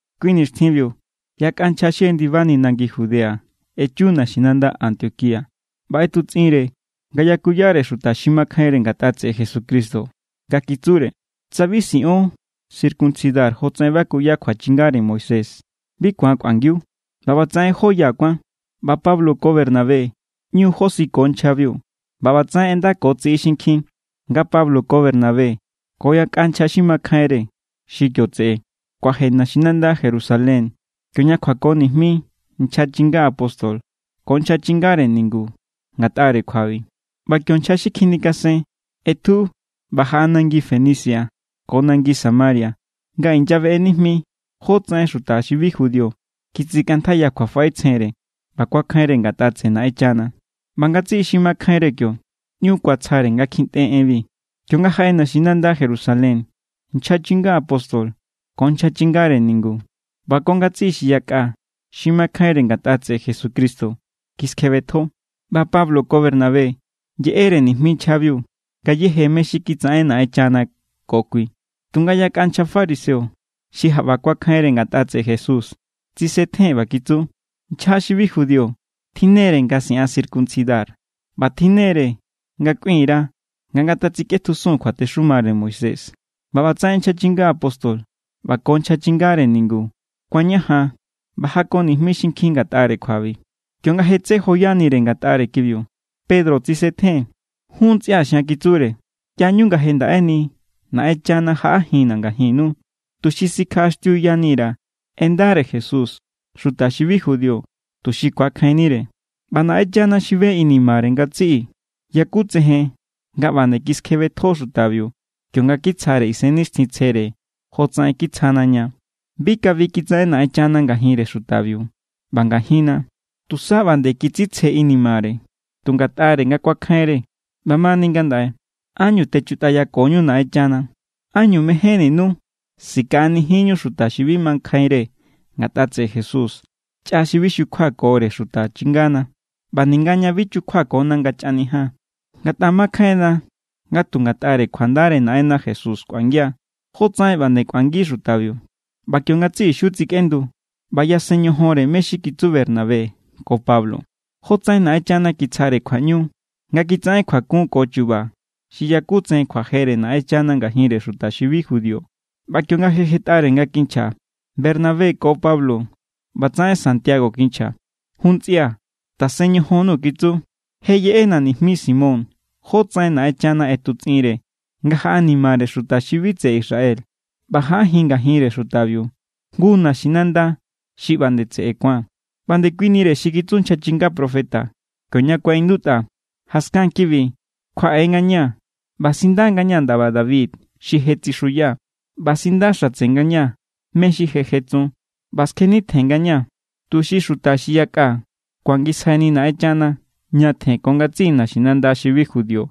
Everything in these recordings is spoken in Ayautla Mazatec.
Kui nixtjinbiu yakꞌa nchja xi jendibani nangi Judea echu naxinanda Antioquía ꞌba ꞌetutsꞌinre nga yakuyare xuta xi makjainre ngatꞌa tseꞌe Jesucristo nga kitsure: —Tsa bi siꞌon circuncidar jotsaꞌen bakuya kjuachingare Moisés, bi ku̱an kꞌuangiu. ꞌBa ꞌbatsaꞌen jó ya kuán. ꞌBa Pablo ko Bernabé ꞌñu josiko nchjabiu. ꞌBa ꞌbatsaꞌen ꞌendako tsiꞌi xinkjin nga Pablo ko Bernabé ko yakꞌa nchja xi makjainre xi kio tseꞌe kuaje naxinanda Jerusalén kioña kjuako nijmi nchja chinga apóstol ko nchja chingare ningu ngatꞌare kjuabi. ꞌBa kio nchja xi kjinikasen ꞌetju ꞌba jaꞌa nangi Fenicia ko nangi Samaria nga inyabeꞌe nijmi jótsaꞌen xuta xi bi judío kitsikꞌantjaiya kjuafaꞌetsjenre ꞌba kuakjainre ngatꞌa tseꞌe Naꞌenchana. ꞌBa ngatsiꞌi xi makjainre kio ꞌñu kuatsjare nga kjintꞌe enbi. Kionga jaꞌe naxinanda Jerusalén, nchja chinga apóstol ko nchja chingare ningu ꞌba ko ngatsiꞌi xi yakꞌa xi makjainre ngatꞌa tseꞌe Jesucristo kiskjebetjo, ꞌba Pablo ko Bernabé yeꞌere nijmi nchjabiu ngayéje mé= xi kitsaꞌen Naꞌenchana ko kui. Tunga yakꞌa nchja fariseo xi jaꞌba kuakjainre ngatꞌa tseꞌe Jesús tsisetjen ꞌba kitsu: —Nchja xi bi judío tjinnere nga siꞌan circuncidar ꞌba tjinnere nga kꞌuin_ra nga ngatatsikꞌetjusun kjuatexumare Moisés. ꞌBa ꞌbatsaꞌen nchja chinga apóstol ꞌba ko nchja chingare ningu kuañajan ꞌba jako nijmi xinkjin ngatꞌare kjuabi. Kionga je tsé joyanire ngatꞌare kibiu, Pedro tsisetjen. —Jun ntsꞌia̱ xian —kitsure—, ꞌyañu nga je ndaꞌeni Naꞌenchana jaꞌajinna̱ ngajinnu, tuxi sikjaꞌaxtiuyani_ra̱ en ndare Jesús xuta xi bi judío, tuxi ku̱akjainnire. ꞌBa Naꞌenchana xi be inimare ngatsiꞌi yakutsejen nga ꞌba nde kiskjebetjo xutabiu kionga kitsjare Isennixtjintsjere jotsaꞌen kitsjana ña. Bi kabi kitsaꞌen Naꞌenchana ngajinre xutabiu ꞌba ngajinna. Tusa ꞌba nde kitsitsje inimare tu ngatꞌare nga kuakjainre. ’ꞌBamani ngandaꞌe, ¿ánñu techutꞌayakoñu Naꞌenchana? ¿Ánñu mejénninu sikaꞌanijinñu xuta xi makjainre ngatꞌa tseꞌe Jesús chꞌa xi bi kichukjuakore xuta chingana ꞌba ninga ña bi chukjuana nga chꞌanijian? Ngatꞌa makjainna nga tu ngatꞌare kjuandare Naꞌenna Jesús kꞌuangia, jotsaꞌen ꞌba nde kꞌuangi xutabiu. ꞌBa kio ngatsiꞌi xiu tsikꞌendu ꞌba yasen ñojonre mé= xi kitsu Bernabé ko Pablo, jotsaꞌen Naꞌenchana kitsjare kjuaꞌñu nga kitsaꞌen kjuakun ko chu̱ba̱ xi yakutsejen kjuajere Naꞌenchana ngajinre xuta xi bi judío. ꞌBa kionga je jetꞌare nga kinchja Bernabé ko Pablo, ꞌbatsaꞌen Santiago kinchja: —Jun ntsía̱, tasen ñojonnu —kitsu—. Je yeꞌena nijmi Simón jótsaꞌen Naꞌenchana ꞌetutsꞌinre nga jaꞌanimare xuta xi bi tseꞌe Israel ꞌba jaꞌajin ngajinre xutabiu jngu naxinanda xi ꞌba nde tseꞌe ku̱an. ꞌBa ndekuinire xi kitsu nchja chinga profeta, kioña kuaꞌindutꞌa: Jaskan kibi kjuaꞌe ngañaa̱, ꞌba sinda ngañaa̱ ndaba David xi je tsixuya, ꞌba sindaxatse ngañaa̱ mé= xi je jetsun, ꞌba skjenitjen ngañaa̱, tuxi xuta xi yakꞌa ku̱angisjaini Naꞌenchana ñatjen ko ngatsiꞌi naxinanda xi bi judío,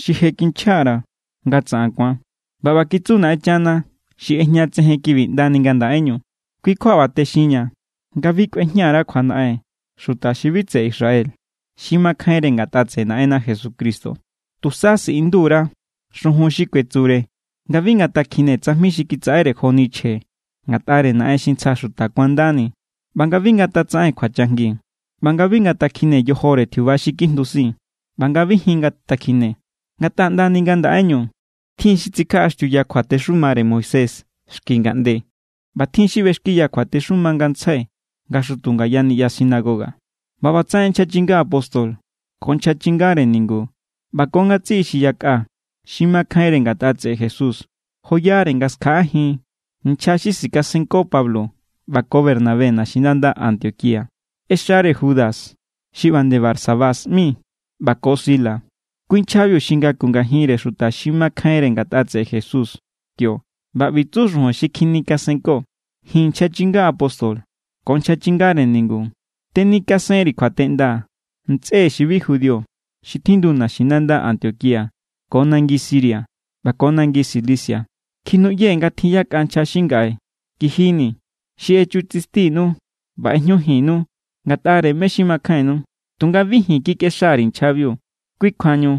xi je kinchja_ra̱ nga tsaꞌan ku̱an. ꞌBa ꞌba kitsu Naꞌenchana xi ꞌejñatsejen kibi ꞌndani ngandaꞌeñu. ’Kui kjua ꞌba texinña̱ nga bi kꞌuejña_ra kjuanaꞌen xuta xi bi tseꞌe Israel xi makjainre ngatꞌa tseꞌe Naꞌenna Jesucristo. Tusa siꞌindu_ra xujun xi kuetsure nga bi ngatakjine tsajmi xi kitsaꞌere joni chje ngatꞌare naꞌen xi ntsja xuta kuandani ꞌba nga bi ngatatsaꞌen kjuachajngi, ꞌba nga bi ngatakjine yojore tjiuba xi kjindusin, ꞌba nga bi jin ngatakjine. Ngatꞌa ꞌndani ngandaꞌeñu tjin xi tsikjaꞌaxtiuya kjuatexumare Moisés xki ngaꞌnde, ꞌba tjin xi ꞌbexkiya kjuatexuma ngantsjai nga xutu ngaya niꞌya sinagoga. ꞌBa ꞌbatsaꞌen nchja chinga apóstol ko nchja chingare ningu ꞌba ko ngatsiꞌi xi yakꞌa xi makjainre ngatꞌa tseꞌe Jesús joyare nga skjaꞌajin nchja xi sikasenko Pablo ꞌba ko Bernabé naxinanda Antioquía. ꞌExare Judas xi ꞌba nde Barsabás ꞌmi ꞌba ko Silas, kui nchjabiu xi ngaku ngajinre xuta xi makjainre ngatꞌa tseꞌe Jesús kio. ꞌBa ꞌbi tsu xujun xi kjinikasenko: “Ji̱n nchja chinga apóstol ko nchja chingare ningu tenikasen_ri̱ kjuateꞌnda ntsꞌe xi bi judío xi tjindu naxinanda Antioquía ko nangi Siria ꞌba ko nangi Cilicia. Kjinuꞌyee̱ nga tjin yakꞌa nchja xi ngaꞌe kijinii̱, xi echutsistinu ꞌba ꞌejñujinnu ngatꞌare mé= xi makjainnu. Tunga bi ji̱n kikꞌexa_ri̱ nchjabiu. Kui kjuañu,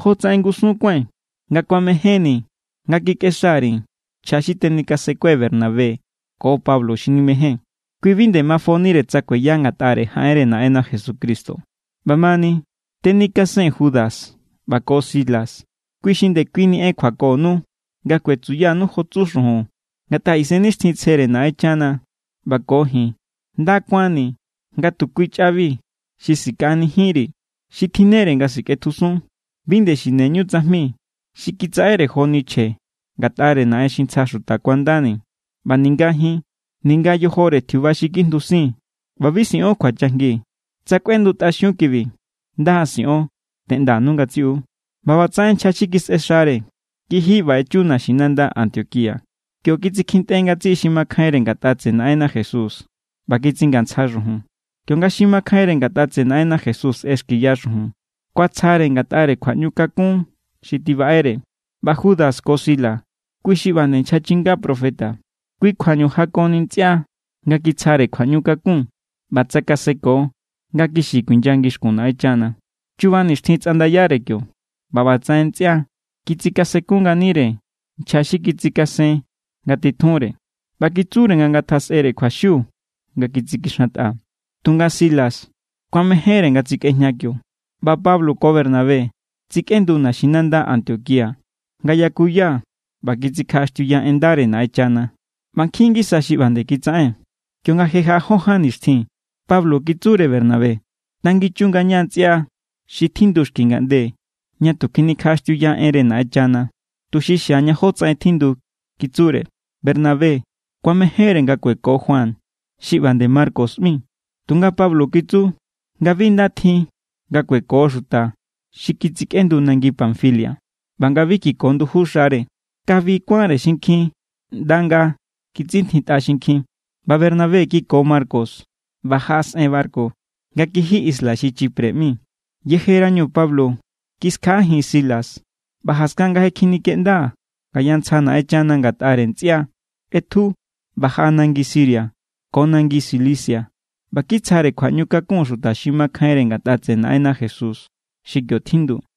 jotsaꞌen ngusun kuái̱n, nga kuamejénni̱ nga kikꞌexa_ri̱ nchja xi tenikasenkue̱ Bernabé ko Pablo xi nimejée̱n. Kui xi bi nde mafonire tsa kueya ngatꞌare jaꞌenre Naꞌenna Jesucristo. ꞌBa ꞌbamani, tenikasee̱n Judas ꞌba ko Silas, kui xi ndekuini en kjuakonu nga kuetsuyanu jo tsu xujun. Ngatꞌa Isennixtjintsjere Naꞌenchana ꞌba ko ji̱n nda kuánni̱ nga tu kui chꞌabi xi sikaꞌanijinri̱, xi tjinnere nga sikꞌetjusun. Bi nde xineñu tsajmi xi kitsaꞌere joni chje ngatꞌare naꞌen xi ntsja xuta kuandani, ꞌba ninga jin, ninga yojore tjiuba xi kjindusin, ꞌba bi siꞌon kjuachajngi. Tsa kꞌuendutꞌaxiun kibi, nda siꞌon. Teꞌndanu ngatsiꞌu.” ꞌBa ꞌbatsaꞌen nchja xi kisꞌexare kiji ꞌba echu naxinanda Antioquía. Kio kitsikjintꞌe ngatsiꞌi xi makjainre ngatꞌa tseꞌe Naꞌenna Jesús ꞌba kitsingantsja xujun. Kionga xi makjainre ngatꞌa tseꞌe Naꞌenna Jesús ꞌexkiya xujun, kuatsjare ngatꞌare kjuaꞌñukakun xi tibaꞌere. ꞌBa Judas ko Silas, kui xi ꞌba nde nchja chinga profeta. Kui kjuañu jakoni ntsꞌia nga kitsjare kjuaꞌñukakun ꞌba tsakaseko nga kixi kuinya ngixkun Naꞌenchana. Chuba nixtjin tsꞌandayare kio, ꞌba ꞌbatsaꞌen ntsꞌia kitsikasenku nganire nchja xi kitsikasen nga titjunre ꞌba kitsure nga ngatasꞌere kjuaxiu nga kitsikixantꞌa. Tunga Silas kuamejénre nga tsikꞌejña kio. ꞌBa Pablo ko Bernabé tsikꞌendu naxinanda Antioquía nga yakuya ꞌba kitsikjaꞌaxtiuya en ndare Naꞌenchana. ꞌBa nkjin ngisa xi ꞌba nde kitsaꞌen. Kionga je jaꞌa jó ján nixtjin, Pablo kitsure Bernabé: —Tanginchun ngaña ntsꞌia xi tjindu xki ngaꞌnde ña tu kjinikjaꞌaxtiuya enre Naꞌenchana, tuxi xiaña jótsaꞌen tjindu —kitsure. Bernabé kuamejénre nga kueko Juan, xi ꞌba nde Marcos ꞌmi, tunga Pablo kitsu nga bi nda tjin nga kueko xuta xi kitsikꞌendu nangi Panfilia ꞌba nga bi kiko nduju xare. Kabi kuánre xinkjin ꞌnda nga kitsintjitꞌa xinkjin. ꞌBa Bernabé kiko Marcos ꞌba jaꞌasꞌen barku nga kiji isla xi Chipre ꞌmi. Yejerañu Pablo kiskjaꞌajin Silas ꞌba, jaskan nga je kjinikeꞌnda ngaya ntsja Naꞌenchana ngatꞌare ntsꞌia, ꞌetju. ꞌBa jaꞌa nangi Siria ko nangi Cilicia ꞌba kitsjare kjuaꞌñukakun xuta xi makjainre ngatꞌa tseꞌe Naꞌenna Jesús xi kio tjindu.